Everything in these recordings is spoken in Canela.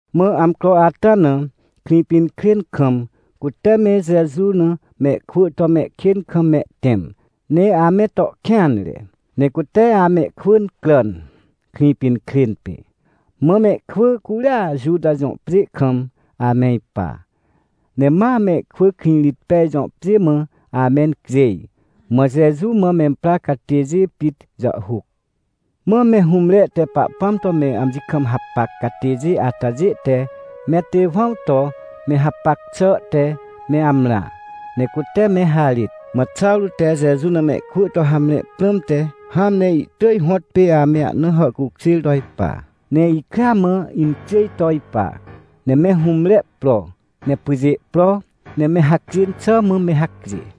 Mã amcro ata na, Krĩpinkrên kam, cute me Jeju na mehkwỳ to mehkên kam mehtẽm ne ame to kêanre. Ne cute amehkwỳ incràn, Krĩpinkrên pê. Mã mehkwỳ curia Juta jõ pjê kam ame ipa, ne ma mehkwỳ Krĩrĩtpej jõ pjê mã ame incjêj, mã Jeju mã memprar catêjê pit jàhhuc. Mã me hũmre te Pahpãm to me amji kam hapac catêjê atajê te me Tewãw to me hapac xàhte me amrã, ne cute me harêt. Mã Xawrô te Jeju na mehkwỳ to hamre prãmte, hãn ne ihtỳj hõtpê ame ahna hàhcukjêr to ipa, ne ikrea mã incjêj to ipa, ne me hũmre pro, ne pyjê pro, ne me hacjên xà mã me hacjê.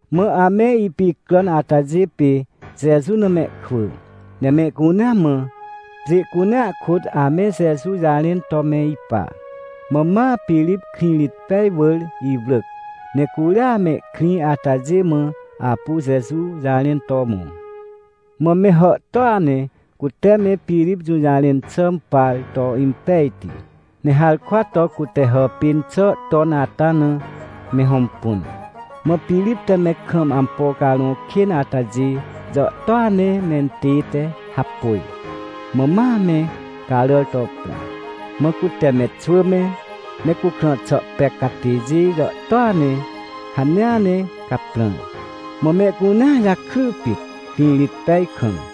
Mã ame ipicràn atajê pê Jeju na mehkwỳ, ne mehcunea mã, pjê cunea kôt ame Jeju jarẽn to me ipa. Mã ma Pirip Krĩrĩtpej wỳr iwrỳc, ne curia mehkrĩ atajê mã apu Jeju jarẽn to mõ. Mã me hàhtôa ne cute me Pirip jũjarẽn xà impar to impejti, ne harkwa to cute hàpên xà ton ata na me hõmpun. Mã Pirip te me kam ampo carõ kên atajê jàhtôa ne mentête hapôj, mã ma me caràr to pra. Mã cute me xwỳ me, me cukrã xà pec catêjê jàhtôa ne hanea ne caprãr. Mã mehcunea jakry pit, Krĩrĩtpej kam.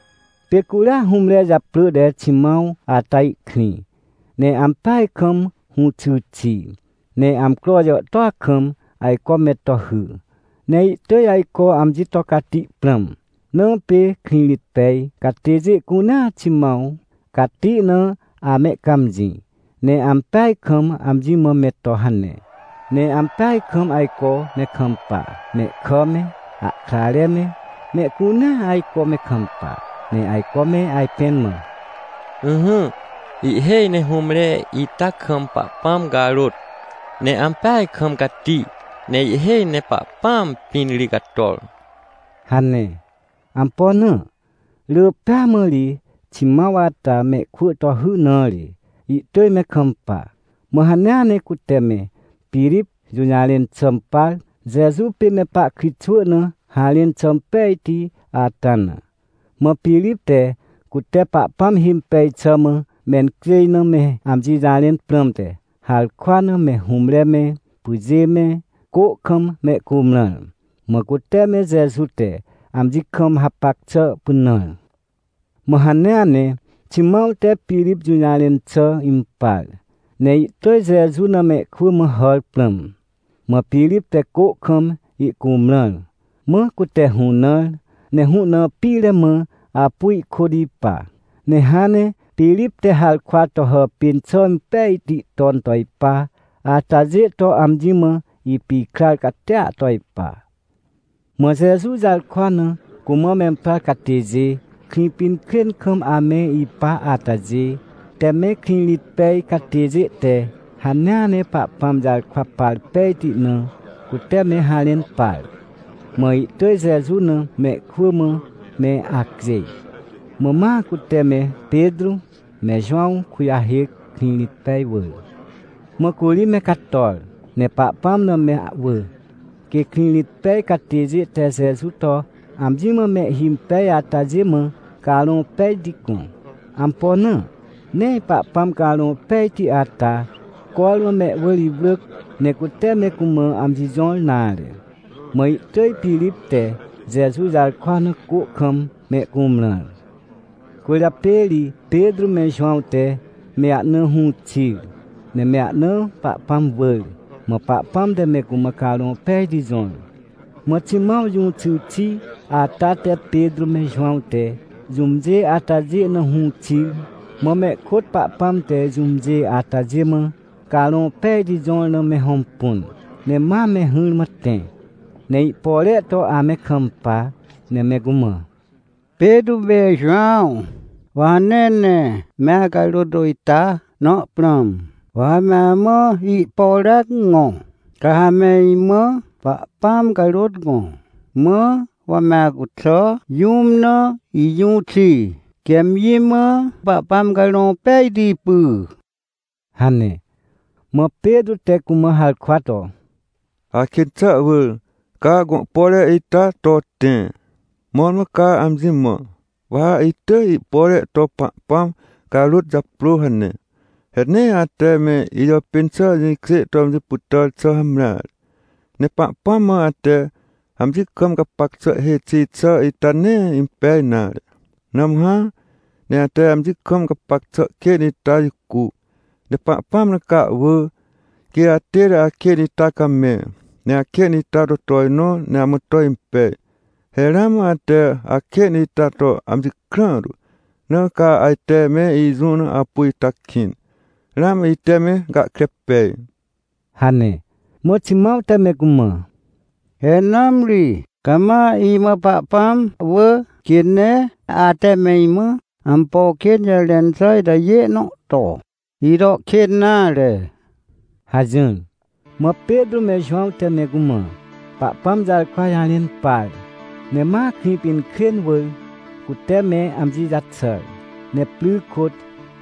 Pê curia hũmre japrỳ te Ximãw ata ihkrĩ, ne ampeaj kam hũxy xi, ne amcro jàhtôa kam ajco me to hy. Ne ihtỳj ajco amji to cati prãm. Na pê Krĩrĩtpej catêjê cunea Ximãw cati na amehcãmjĩ, ne ampeaj kam amji mã me to hane. Ne ampeaj kam ajco me kampa. Mehkà me, ahkrare me, mehcunea ajco me kampa. Ne ajco me ajpẽn mã: — Ỹhỹ, ihhêj ne hũmre ita kam Pahpãm carôt, ne ampeaj kam cati, ne ihhêj ne Pahpãam pĩn ri cator — hane. Ampo na? Rỳ pêa mã ri Ximãw ata mehkwỳ to hy na ri, ihtỳj me kampa. Mã hanea ne cute me Pirip jũjarẽn xà impar, Jeju pê me pahkritxwỳ na harẽn xà impejti ata na. Mã Pirip te cute Pahpãm himpej xà mã mencjêj na me amji jarẽn prãmte, harkwa na me hũmre me, pyjê me, cô kam mehcumrãr, mã cute me Jeju te amji kam hapac xà pynãr. Mã hanea ne, Ximãw te Pirip jũjarẽn xà impar, ne ihtỳj Jeju na mehkwỳ mã hàr prãm. Mã Pirip te cô kam ihcumrãr, mã cute hũnãr ne hũ na pire mã apu ihkôt ipa, ne hãn ne Pirip te harkwa to hàpên xà impejti ton to ipa atajê to amji mã ipikrar catia to ipa. Mã Jeju jarkwa na cumã memprar catêjê, Krĩpinkrên kam ame ipa atajê, te me Krĩrĩtpej catêjê te hanea ne Pahpãm jarkwa par pejti na, cute me harẽn par. Mã ihtỳj Jeju na mehkwỳ mã me acjêj. Mã ma cute me Petrô me Jowãw kujahêc, Krĩrĩtpej wỳr. Mã curi me cator, ne Pahpãm na me ahwỳ, quê Krĩrĩtpej catêjê te Jeju to amji mã mehhimpej atajê mã Carõ Pejti gõ. Ampo na? Nee Pahpãm Carõ Pejti ata cormã mehwỳr iwrỳc, ne cute me cumã amji jõr nare. Mã ihtỳj Pirip te Jeju jarkwa na cô kam mehcumrãr. Cwỳrjapê ri Petrô me Jowãw te me ahna hũ xir, ne me ahna Pahpãm wỳr, mã Pahpãm te me cumã Carõ Pejti jõr. Mã Ximãw jũxy xi ata te Petrô me Jowãw te jũmjê atajê na hũ xir, mã mehkôt Pahpãm te jũmjê atajê mã Carõ Pejti jõr na me hõmpun. Ne ma me hỹrmã tẽ, ne ihpore to ame kampa, ne me cumã: — Petrô me Jowãw, wa hanea ne me acarôt ita na prãm. Wa ha me amã ihporea gõ, ca ha me imã Pahpãm carôt gõ, mãr wa me acuxà jũm na ijũ xi, quê amji mã Pahpãm Carõ Pejti py — hane. Mã Petrô te cumã harkwa to: — Akên xà wỳr, ca gõ pore ita to tẽ! Mõrmõ ca amji mã: “Wa ha itỳj ihpore to Pahpãm carôt japrô” hane. He nee ate me ijàpên xà jĩkjê to amji pytàr xà hamreare. Ne Pahpãm mã ate amji kam gapac xà hêj xi xà ita nee impej nare. Nãmhã, ne ate amji kam gapac xà kên ita jicu, ne Pahpãm na ca ahwỳ, quê atête akên ita camẽ, ne akên ita to tojnõ ne amã to impej. He ramã ate akên ita to amji krãhtu, na ca ajte me ijũ na apu ita kĩn, ramã ite me gahkre pej — hane. Mã Ximãw te me cumã: — He nãmri! Ca ma imã Pahpãm wỳ, quê nee ate me imã ampo kên jarẽn xà itajê nõ to, ito kên nare — hajỹr. Mã Petrô me Jowãw te me cumã Pahpãm jarkwa jarẽn par, ne ma Krĩpinkrên wỳr cute me amji jaxàr. Ne pry kôt,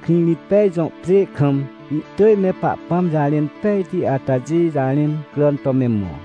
Krĩrĩtpej jõ pjê kam ihtỳj me Pahpãm jarẽn pejti atajê jarẽn cràn to me mõ.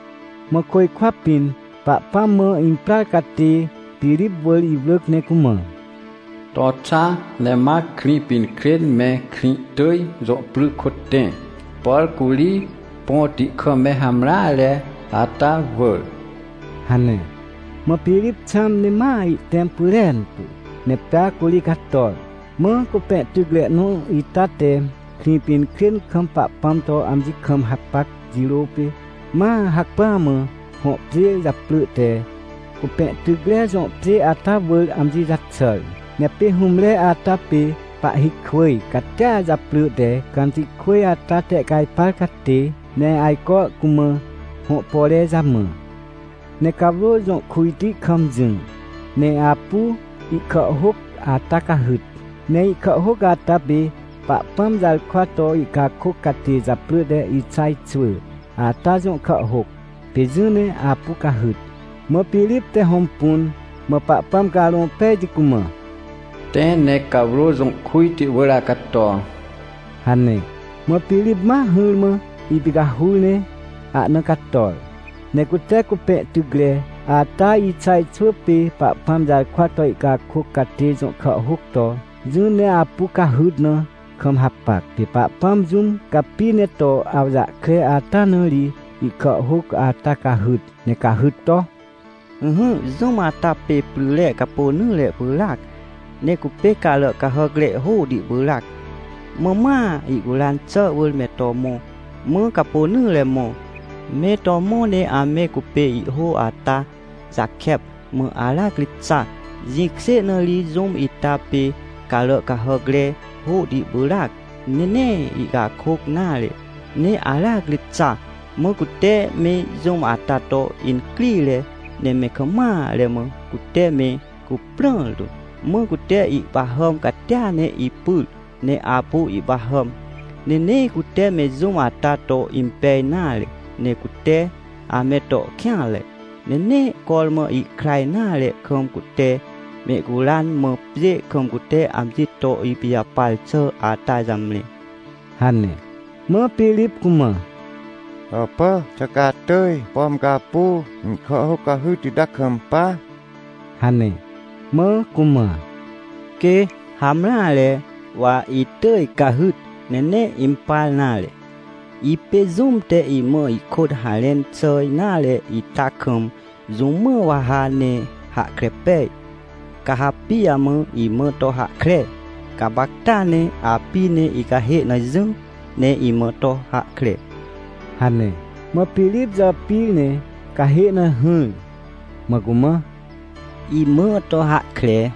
Mã côjkwa pĩn Pahpãm mã imprar catê Pirip wỳr iwrỳc ne cumã: — To xa, ne ma Krĩpinkrên me Krĩhtỳj jõ pry kôt tẽ, por curi põti kam me hamreare, ata wỳr — hane. Mã Pirip xãm ne ma ihtẽm pyrentu. Ne pea curi cator. Mã cupẽtycre nõ ita te Krĩpinkrên kam Pahpãm to amji kam hapac jirô pê, ma hacpỹa mã hõ pjê japrỳ te Cupẽtycre jõ pjê ata wỳr amji jaxàr. Ne pê hũmre ata pê pahhikwỳj catia japrỳ te Cantikwỳj ata tehcajpar catê, ne ajco cumã hõ pore jamã. Ne cawrô jõ kujti kam jỹ, ne apu ihkàhhôc ata cahyt. Ne ihkàhhôc ata pê Pahpãm jarkwa to ihcakôc catê japrỳ te Ixaj xwỳ, ata jõ kàhhôc, pê jỹ ne apu cahyt. Mã Pirip te hõmpun, mã Pahpãm Carõ Pejti cumã: — Tẽ ne cawrô jõ kujti wỳr acato — hane. Mã Pirip ma hỹrmã ipicahur ne ahna cator. Ne cute cupẽtycre ata Ixaj xwỳ pê Pahpãm jarkwa to ihcakôc catê jõ kàhhôc to jỹ ne apu cahyt na kam hapac. Pê Pahpãm jũm capi ne to awjahkre ata na ri ihkàhhôc ata cahyt, ne cahyt to: “Ỹhỹ, jũm ata pê pryre capônỹre pyràac, ne cupê carà cahàcre hôhti pyràac. Mã ma ihcuran xà wỳr me to mõ, mã capônỹre mõ. Me to mõ ne ame cupê ihhô ata jakep, mã aracri xa, jĩkjê na ri jũm ita pê carà cahàcre hôhti pyràac, ne nee ihcakôc nare, ne aracri xa. Mã cute me jũm ata to incrire, ne me kam mare mã cute me cuprãr tu, mã cute ihpahàm catia ne ipyr, ne apu ihpahàm. Ne nee cute me jũm ata to impej nare, ne cute ame to kêanre. Ne nee cormã ihkra nare kam, cute mehcuran, mã pjê kam cute amji to ipijapar xà ata jamre” hane. Mã Pirip cumã: — Hàpà, xà ca atỳj, pom ca apu ihkàhhôc cahyt ita kampa? — hane. Mã cumã: — Quê, hamreare, wa itỳj cahyt ne nee impar nare. Ipê jũm te imã ihkôt harẽn xà nare ita kam, jũ mã wa ha ne hahkre pej? Ca ha pijamã imã to hahkre? Gapacta ne api ne icahê na jỹ, ne imã to hahkre — hane. Mã Pirip jàpir ne cahê na hỹr, mã cumã: — Imã to hahkre,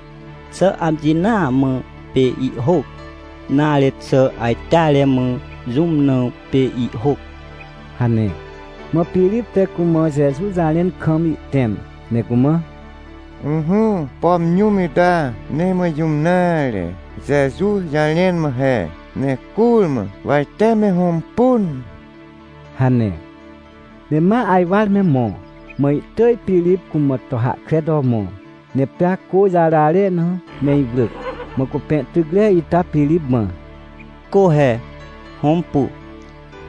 xà amji naa mã pê ihhôc? Nare xà ajteare mã jũm na pê ihhôc? — hane. Mã Pirip te cumã Jeju jarẽn kam ihtẽm, ne cumã: — Ỹhỹ, pom jũm ita nee mã jũm nare, Jeju jarẽn mã he, ne curmã wa ite me hõmpun — hane. Ne ma ajwar me mõ, mã ihtỳj Pirip cumã to hahkre to mõ, ne pea cô jarare na me iwrỳc. Mã cupẽtycre ita Pirip mã: — Cô he, hõmpu.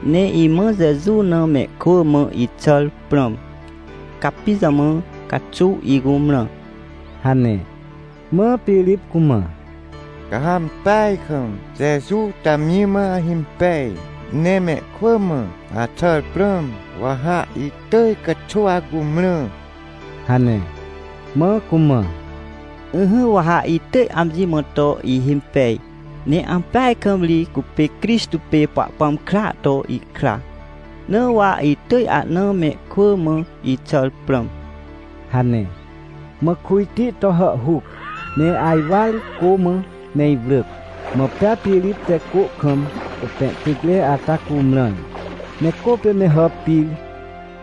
Ne imã Jeju na mehkwỳ mã ixàr prãm. Ca pijamã caxuw icumrã? — hane. Mã Pirip cumã: — Ca ha ampeaj kam Jeju to amji mã ahimpej, ne mehkwỳ mã axàr prãm, wa ha itỳj caxuw acumrã — hane. Mã cumã: — Ỹhỹ, wa ha itỳj amji mã to ihimpej, ne ampeaj kam ri cupê Crixtô pê Pahpãm kraa to ihkra, na wa itỳj ahna mehkwỳ mã ixàr prãm — hane. Mã kujti to hàhhuc, ne ajwar cô mã me iwrỳc, mã pea Pirip te cô kam cupẽtycre ata cumrãr. Ne cô pê me hàpir,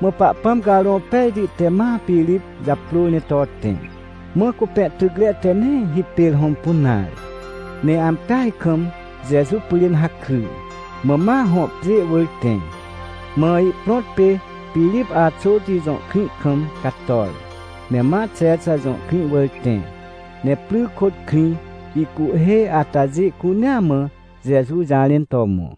mã Pahpãm Carõ Pejti te ma Pirip japrôr ne to tẽ. Mã cupẽtycre te nee hipêr hõmpun nare, ne ampeaj kam Jeju pyrên hakry, mã ma hõ pjê wỳr tẽ. Mã ihprõt pê Pirip Axoti jõ krĩ kam cator. Ne ma Xexa jõ krĩ wỳr tẽ, ne pry kôt krĩ ihcuhhê atajê cunea mã Jeju jarẽn to mõ.